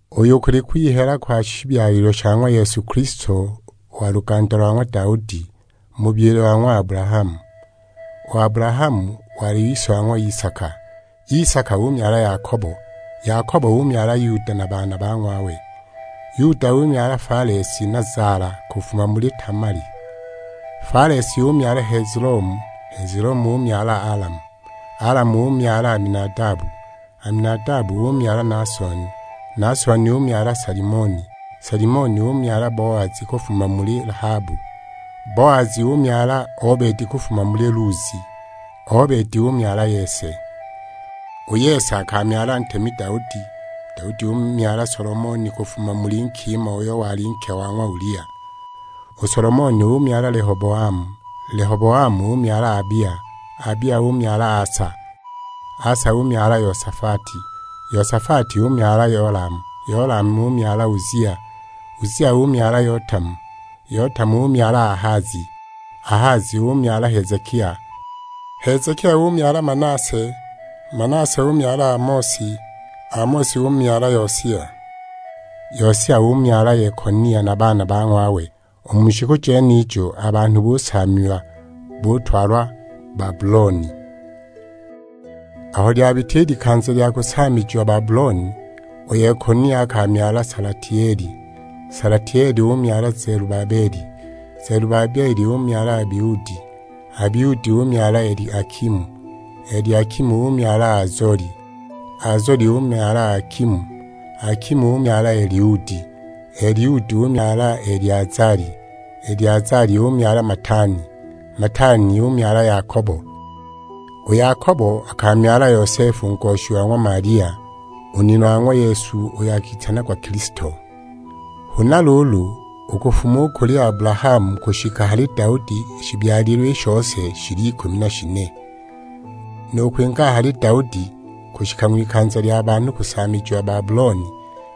Uyu kuli kwihela kwa shibyalilwe sha ng'wa Yesu Kilisto wa luganda lwa ng'wa Daudi, mu bubyile wa ng'wa Abulahamu. U Abulahamu wali ise wa ng'wa Isaka, Isaka umyala Yakobo, Yakobo umyala Yuda na baana ba ng'wawe. Yuda umyala Falesi na Zala, kufuma muli Tamali. Falesi umyala Hezelomu, Hezelomu umyala Alamu. Alamu umyala Aminadabu, Aminadabu umyala Naasoni, Naasoni umyala Salimoni. Salimoni umyala Boazi kufuma muli Lahabu, Boazi umyala Obedi kufuma muli Luzi, Obedi umyala Yese. U Yese akamyala ntemi Daudi, Daudi umyala Solomoni kufuma muli nkima uyo wali nke wa ng'wa Ulia. U Solomoni umyala Lehoboamu, Lehoboamu umyala Abia, Abia umyala Asa. Asa umyala Yosafati, Yosafati umyala Yolamu, Yolamu umyala Uzia. Uzia umyala Yotamu, Yotamu umyala Ahazi, Ahazi umyala Hezekia. Hezekia umyala Manase, Manase umyala Amosi, Amosi umyala Yosia. Yosia umyala Yekonia na baana ba ng'wawe; u mu shiku jenijo a banhu busaamiwa, butwalwa Babuloni. Aho lyabita i likanza lya kusaamijiwa Babuloni, u Yekonia akamyala Salatieli, Salatieli umyala Zelubabeli. Zelubabeli umyala Abiudi, Abiudi umyala Eliakimu, Eliakimu umyala Azoli. Azoli umyala Akimu, Akimu umyala Eliudi. Eliudi umyala Eleazali, Eleazali umyala Matani, Matani umyala Yakobo. U Yakobo akamyala Yosefu u ngoshi wa ng'wa Malia, u nina wa ng'wa Yesu, uyo akitanagwa Kilisto. Huna luulu, u kufuma u kuli Abulahamu kushika hali Daudi, i shibyalilwe i shose shili ikumi na shine; nu kwinga a hali Daudi kushika ng'wikanza lya banhu kusaamijiwa Babuloni,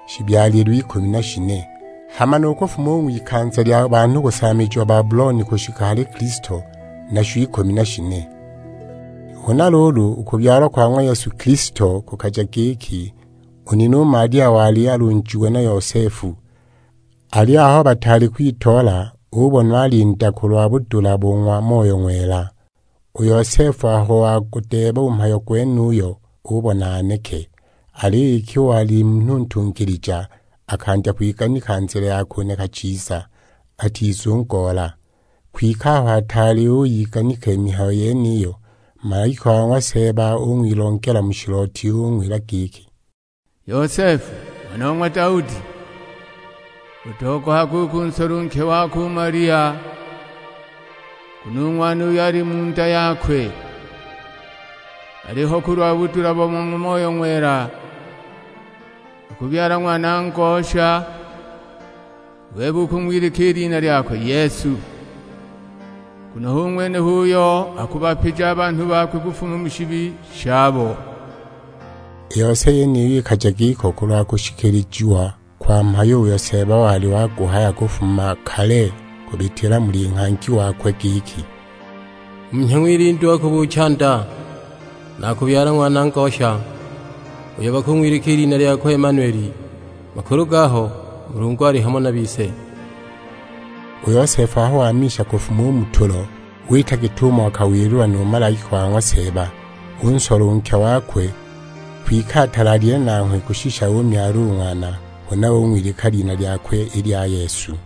shibyalilwe ikumi na shine. Hama nu kufuma u ng'wikanza lya banhu kusaamijiwa Babuloni kushika hali Kilisto, nasho ikumi na shine. Huna luulu, u kubyalwa kwa ng'wa Yesu Kilisto kukaja giki, u nina u Malia wali alunjiwe na Yosefu; aliyo aho bataali kwitoola, ubonwa ali nda kulwa budula bo ng'wa Moyo Ng'wela! U Yosefu aho wagudeeba u mhayo gwenuyo, ubona aneke. Aliyo iki wali munhu ntungilija, akandya kwiganika nzila ya kuneka chiza; atizungoola. Kwike aho ataali uyiganika i mihayo yeniyo, malaika wa ng'wa Seeba ung'wilongela mu shilooti; ung'wila giki, "Yosefu ng'wana wa ng'wa Daudi, utogohage u kunsola u nke wako u Malia; nguno u Ng'wana uyo ali u mu nda yakwe aliho kulwa budula bo ng'wa Moyo Ng'wela. Akubyala Ng'wana ngosha, u bebe ukung'wilika i lina lyakwe Yesu; nguno hu ng'wene uyo akubapija a banhu bakwe kufuma mu shibi shabo." I yose yeniyi ikaja giko kulwa kushikilijiwa kwa mhayo uyo Seeba wali waguhaya kufuma kale kubitila muli nghangi wakwe; giki, "Munhya ng'wilindu akubuucha nda, na akubyala ng'wana ngosha, uyo bakung'wilika i lina lyakwe Emmanueli." Makulu gaho, "Mulungu ali hamo na bise." U Yosefu aho wamisha kufuma u mu tulo, wita git'umo akawililwa nu malaika wa ng'wa Seeba; unsola u nke wakwe. Kwike atalaalile nanghwe kushisha umyala u Ng'wana, huna ung'wilika i lina lyakwe i lya Yesu.